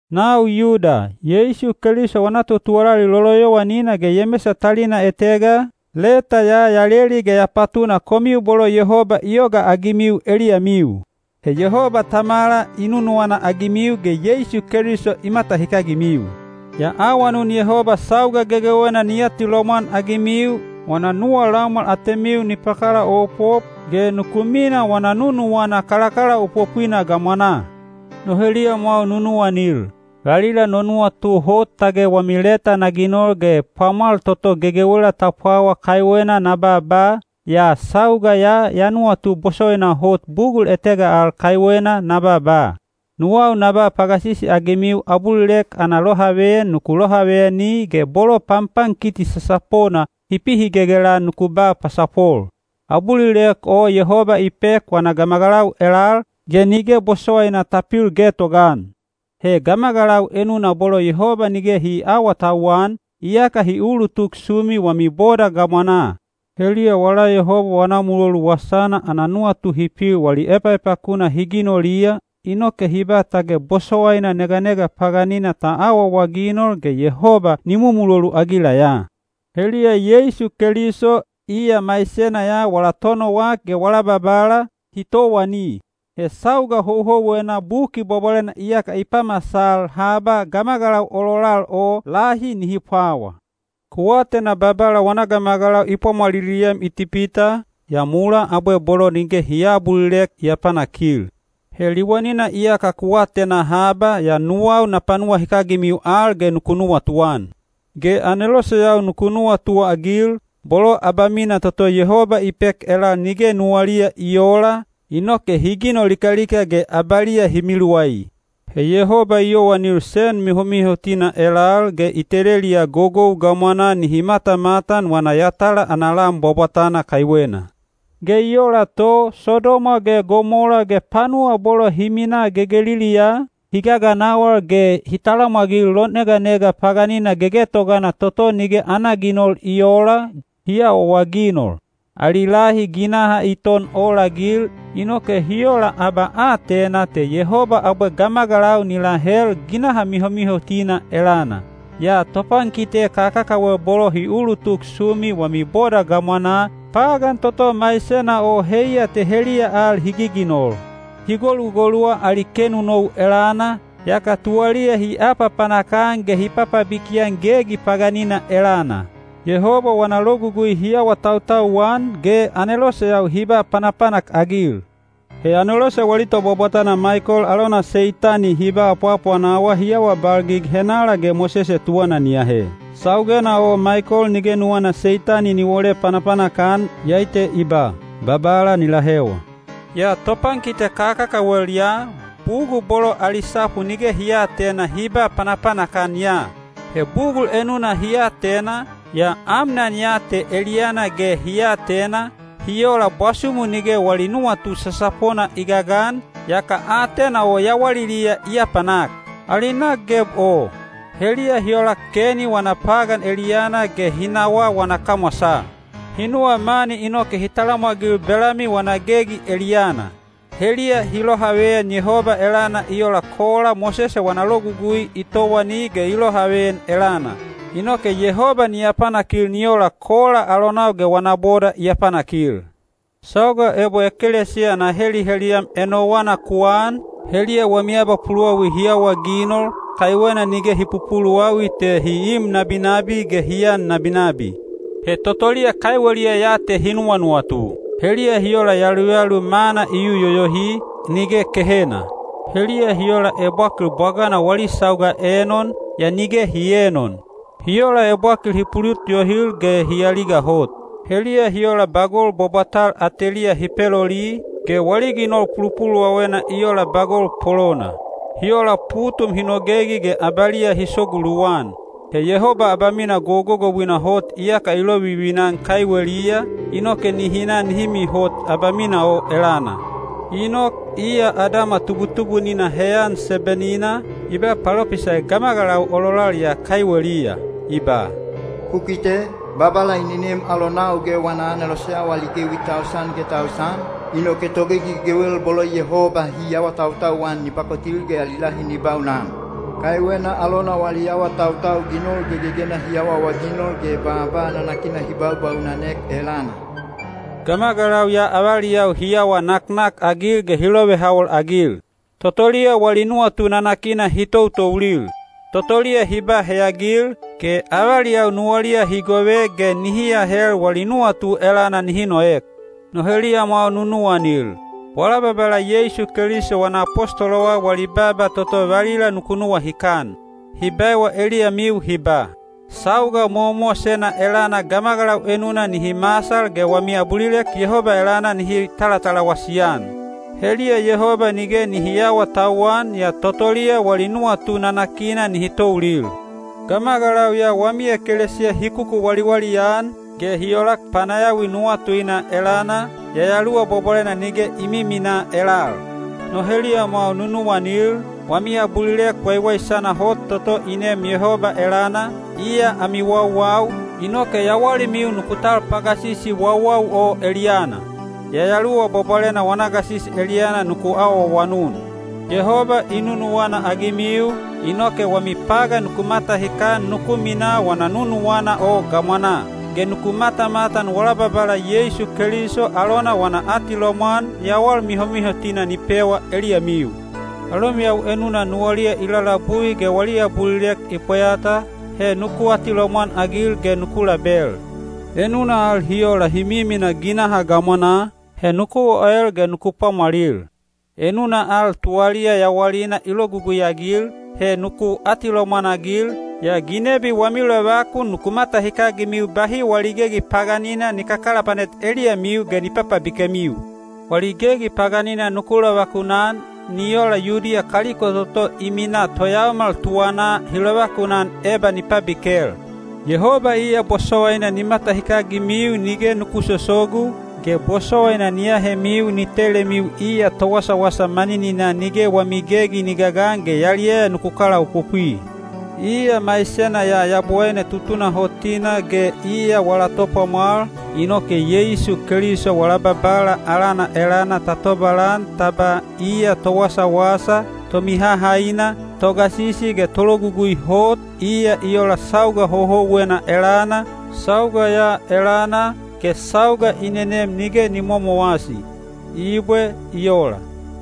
Nau Yuda, Yeisu Keliso wana totuwalali loloyowanina ge Yemesa talina etega, leta ya ya leli ge ya patuna komiu bolo Yehoba i yogaagimiu eliyamiu. He Yehoba Tamala i nunuwana-agimiu ge Yeisu Keliso i matahikagimiu. Ya awanun Yehoba sauga gegewena ni atilomwan-agimiu, wana nuwa laumwal atemiu ni pakalaopop, ge nuku minaa wana nunuwana kalakalaopopwina gamwanaa. No heliyamwau nunuwanil, valila no nuwatu hot tage wami leta na ginol ge pwamwal toto gegewela ta pwawa kaiwena na baaba, yaa sauga ya ya nuwatu bosowaina hot bugul etega al kaiwena na baaba. Nuwau na ba pagasisi-agimiu abulilek ana lohaveyan nuku lohaveyani ge bolo panpankiti sasapona hi pihigelgel-an nuku ba pasapol. Abulilek o Yehoba i pek wana gamagalau elal, ge nige bosowaina ta pil getogaan. He gamagalau enuna bolo Yehoba nige hi aawatauwan, iyaka hi ulutuk sumi wami boda gamwanaa. Heliya wala Yehoba wana mulolu wasana ana nuwatu hi pil wali epaepakuna hi ginoliya, inoke hi ba tage bosowaina neganega paganina ta awaawaginol ge Yehoba ni mumulolu-agila ya. Heliya Yeisu Keliso, iya maisena ya wala Tonowak ge wala Babala, hi towani. He sauga houhouwena Buki Bwabwalena iyaka i pamasal haba gamagalau ololal o lahi nihi pwawa. Ku atena Babala wana gamagalau i pwamwaliliem Itipita, yaa mulaa abwe bolo nige hi aabulilek i apanakil. He liwanina iyaka ku atena haba, yaa nuwau na panuwahikagimiu al ge nuku nuwatuan. Ge aneloseyau nuku nuwatuagil, bolo abamina toto Yehoba i pek elal nige nuwaliya i oola, inoke hi ginol likalika ge abaliya hi miluwai. He Yehoba i yowanil sen mihomihotina elal, ge i teleliya gogou gamwanaa nihi matamatan wana yatala ana lan bwabwatana kaiwena. Ge i ola to, Sodoma ge Gomola ge panuwa bolo hi minaa gegeliliyaa, hi gaganawal ge hi talamwagil loneganega paganina gegetogana toto nige ana ginol i oola, hi awaawaginol. Ali lahi ginaha i ton olagil, inoke hi ola abaatena te Yehoba abwe gamagalau ni lahel ginaha mihomihotina elana. Yaa topankite kakakawel bolo hi ulutuk sumi wami boda gamwanaa, pagan toto maisena o heiya te heliya al hi giginol. Hi golugoluwa ali kenonou elana, yaka tuwaliya hi apapanak-an ge hi papabiki-an gegi paganina elana. Yehoba wana logugui hi awatautau-an, ge aneloseyau hi ba panapanak-agil. He anelose wali tobwabwatana Maikol alona Seitani hi ba apwaapwanawa hi awabalgig henala ge Mosese tuwana ni ahe. Saugena o Maikol nige nuwana Seitani ni wole panapanak-an, iyai te i ba, “Babala ni lahewa.” Yaa topankite kakakawel ya, bugul bolo ali sapu nige hi aatena hi ba panapanak-an ya. He bugul enuna hi atena, yaa amnan ya te eliyana ge hi atena, hi ola bwasumu nige wali nuwatu sasapona i gagan, yaka aatena o yawaliliya i apanak. Ali nak geb o! Heliya hi olak Keni wana pagan eliyana ge hi nawaa wana kamwasaa. Hi nuwa mani inoke hi talamwagil Belami wana gegi eliyana. Heliya hi lohaveyan Yehoba elana i ola Kola Mosese wana logugui i towani ge i lohaveyan elana. Inoke Yehoba ni apanakil ni ola Kola alonau ge wana boda i apanakil. Sauga ebo ekelesiya ana heliheliyam enowana ku an, heliya wami abapuluwawi hi awaginol, kaiwena nige hi pupuluwawi te hi im nabinabi ge hi an nabinabi. He totoliya kaiweliya ya te hi nuwanuwatu. Heliya hi ola yaluyalu mana i yu yoyohi, nige kehena. Heliya hi ola ebwakil bwagana wali sauga enon, yaa nige hi eenon. Hi ola ebwakil hi pulut yohil ge hi aliga hot. Heliya hi ola bagol bwabwatal ateliya hi peloli, ge wali ginol pulupuluwawena i ola bagol polona. Hi ola putum hi nogegi ge abaliya hi sogu luwan. He Yehoba abamina gogogouina hot iyaka i lovivina-an kaiweliya, inoke nihi na nihi mihot abamina o elana. Inok, iya Adama tubutubunina heyan seben-ina, i ba palopisai gamagalau ololal ya kaiweliya. I ba, “Ku kite! Babala i nenem alonau ge wana aneloseyau ali gewi tausan ge tausan, inoke togegi gegewel bolo Yehoba hi awatautau-an ni pakotil ge ali lahi ni baunan. Kaiwena alona wali awatautau ginol gegegena hi awaawaginol ge baaba nanakina hi babaunanek elana.” Gamagalau ya avaliyau hi awa naknakagil ge hi lovehawol-agil. Totoliya wali nuwatu nanakina hi toutoulil. Totoliya hi ba heyagil, ge avaliyau nuwaliya hi gove ge nihi ahel wali nuwatu elana nihi noek. No heliyamwau nunuwanil, wala Babala Yeisu Keliso wana apostolowau wali baaba toto valila nuku nuwahikan. Hi baewa eliyamiu hi ba, “Sauga mowamowasena elana gamagalau enuna nihi masal ge wami abulilek Yehoba elana nihi talatalawasi-an. Heliya Yehoba nige nihi aawatauwan, yaa totoliya wali nuwatu nanakina nihi toulil.” Gamagalau ya wami ekelesiya hi kukuwaliwali-an, ge hi olak panayawi nuwatuina elana, Yayaluwa Bwabwalena nige i miminaa elal. No heliyamwau nunuwanil, wami abulilek waiwaisana hot toto i neem Yehoba elana, iya ami wauwau, inoke yawalimiu nuku tal pagasisi wauwau o eliyana. Yayaluwa Bwabwalena wana gasisi eliyana nuku awaawanun. Yehoba i nunuwana-agimiu, inoke wami pagan nuku matahikan nuku minaa wana nunuwana o gamwanaa. Ge nuku matamatan wala Babala Yeisu Keliso alona wana atilomwan yawal mihomihotina ni pewa eliyamiu. Alomiyau enuna nuwaliya i lalabui ge wali abulilek i pweyata, he nuku atilomwan-agil ge nuku label. Enuna al hi ola hi miminaa ginaha gamwanaa, he nuku oel ge nuku pwamwalil. Enuna al tuwaliya yawalina i logugui-agil, he nuku atilomwan-agil, yaa ginebi wami lovakun nuku matahikagimiu bahi wali gegi paganina ni kakalapanet eliyamiu ge ni papabikemiu. Wali gegi paganina nuku lovakunan, ni ola Yudiya kaliko toto i minaa toyaomal tuwanaa hi lovakunan eba ni pabikel. Yehoba iya bosowaina ni matahikagimiu nige nuku sosogu, ge bosowaina ni ahemiu ni telemiu iya Towasawasa manininaa nige wami gegi ni gagan ge yaliyaya nuku kalaopopwi. Iya maisena ya Yabowaine tutunahotina ge iya wala Topwamwal, inoke Yeisu Keliso wala Babala alana elana ta tobalan ta ba iya Towasawasa, Tomihahaina, Togasisi ge Tologugui Hot, iya i ola sauga houhouwena elana, sauga ya elana, ge sauga i nenem nige ni momowasi. Ibwe. I ola.